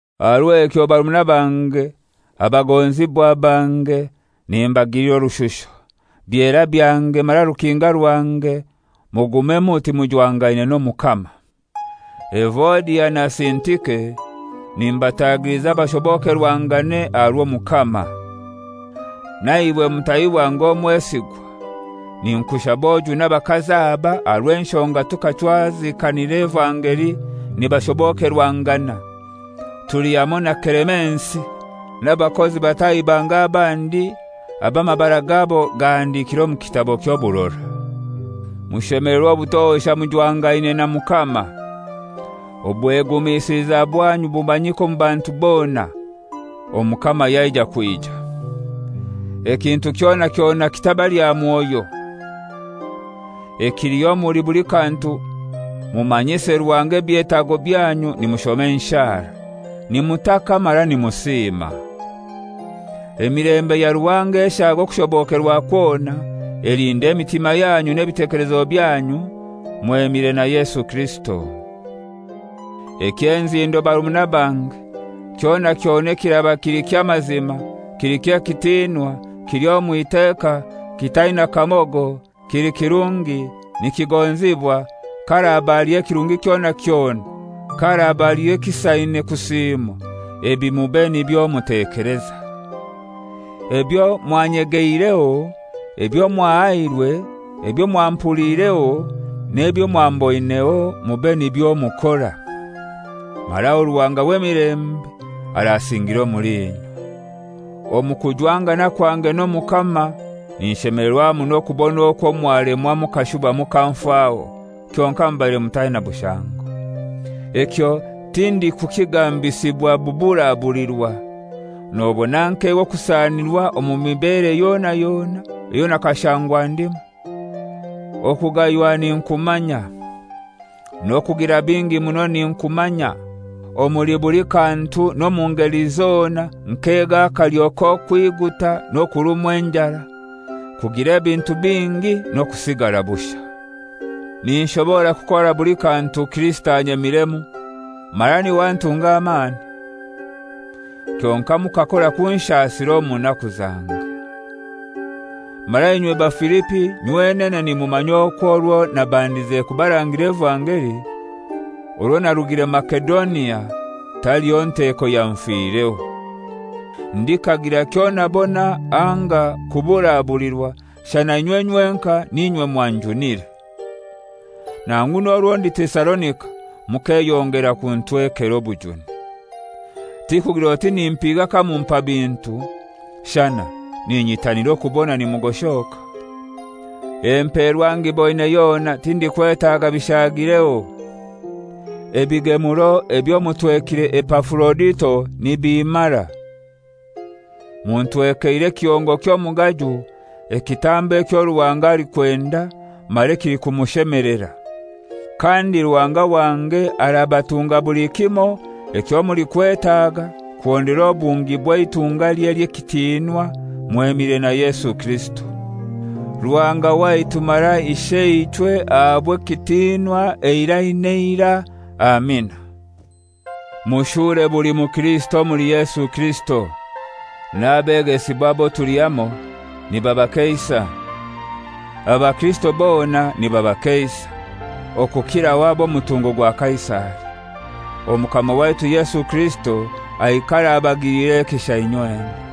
Aha rw'ekyo barumuna bange, abagonzibwa bange, nimbagilira orushusho, byera byange mara rukinga rwange, mugume muti mujwangaine n'Omukama. Evodia na Sintike nimbatagiliza bashobokerwangane aha rw'Omukama. Naiwe mutahi wange omwesigwa, ninkushaba ojune abakazi aba, aha rw'enshonga tukachwazikanira evangeli nibashobokerwangana, tuli hamoi na Kelemensi n'abakozi batahi bange abandi abo amabara gabo gahandikire omu kitabo ky'oburora. Mushemelerwe obutosha mujwangaine na Mukama. Obwegumisiliza bwanyu bumanyike omu bantu bona, Omukama yaija kwija. Ekintu kyona kyona kitabalya mwoyo. Ekiliho omuli buli kantu mumanyise Ruhanga ebyetago byanyu nimushoma enshara, nimutaka mara nimusiima. Emilembe ya Ruhanga eshaaga okushobokerwa kwona, elinde emitima yanyu n'ebitekelezo byanyu mwemire na Yesu Kirisito. Eky'enzindo barumuna bange, kyona kyona ekiraba kili ky'amazima, kili ky'ekitinwa, kili omw'iteka, kitaina kamogo, kili kirungi, nikigonzibwa, ka haraba haliho ekirungi kyona kyona, ka haraba haliho ekisaine kusiimwa, ebi mube nibyo mutekeleza. Ebyo mwanyegeireho, ebyo mwahairwe, ebyo mwampuliireho, n'ebyo mwamboineho mube nibyo mukora; mara aho Ruhanga w'emilembe arasingira omuli inywe. Omu kujwangana kwange n'Omukama ninshemelerwa muno kubona okwo mwalemwa mukashuba mukanfaho, kyonkai mubaire mutaina bushango. Ekyo tindikukigambisibwa buburabulirwa; nobona nkega okusanirwa omu mibere yona yona eyo nakashangwa ndimu. Okugaywa ninkumanya, n'okugira bingi muno ninkumanya. Omuli buli kantu n'omu ngeli zona nkega akalyo k'okwiguta n'okurumwa enjara, kugira ebintu bingi n'okusigara bushai. Ninshobora kukora buli kantu Kirisito anyemiremu, mara niwe antunga amani. Kyonkai mukakora kunshasira omu naku zange. Mara inywe Bafilipi nywenene nimumanya okwo orwo nabandize kubarangira evangeli, orwo narugire Masedonia, taliho nteeko yanfireho. Ndikagira kyonabona anga kuburabulirwa, shana inywe nywenkai n'inywe mwanjunire. Nangu n'orwo ndi Tesalonika mukeyongera kuntwekera obujuni. Tikugir'oti nimpiga kamumpa bintu; shana ninyitanira okubona nimugoshoka. Emperwa ngiboine yona, tindikwetaga bishaagireho. Ebigemuro ebyo mutwekire Epafurodito nibimmara. Muntwekeire ekihongo ky'omugaju, ekitambo ekyo Ruhanga alikwenda mara ekilikumushemelera. Kandi Ruhanga wange arabatunga buli kimoi ekyo mulikwetaga kuhondera obungi bw'eitungalye ely'ekitinwa mwemire na Yesu Kirisito. Ruhanga waitu mara Isheichwe ahabwe ekitinwa eirai n'eirai. Amina. Mushure buli mukirisito omuli Yesu Kirisito. N'abegesibwa abo tuli hamoi nibabakeisa. Abakirisito bona nibabakeisa, okukiraho ab'omutungo gwa Kaisari. Omukama waitu Yesu Kirisito aikare abagilire ekisha inywena.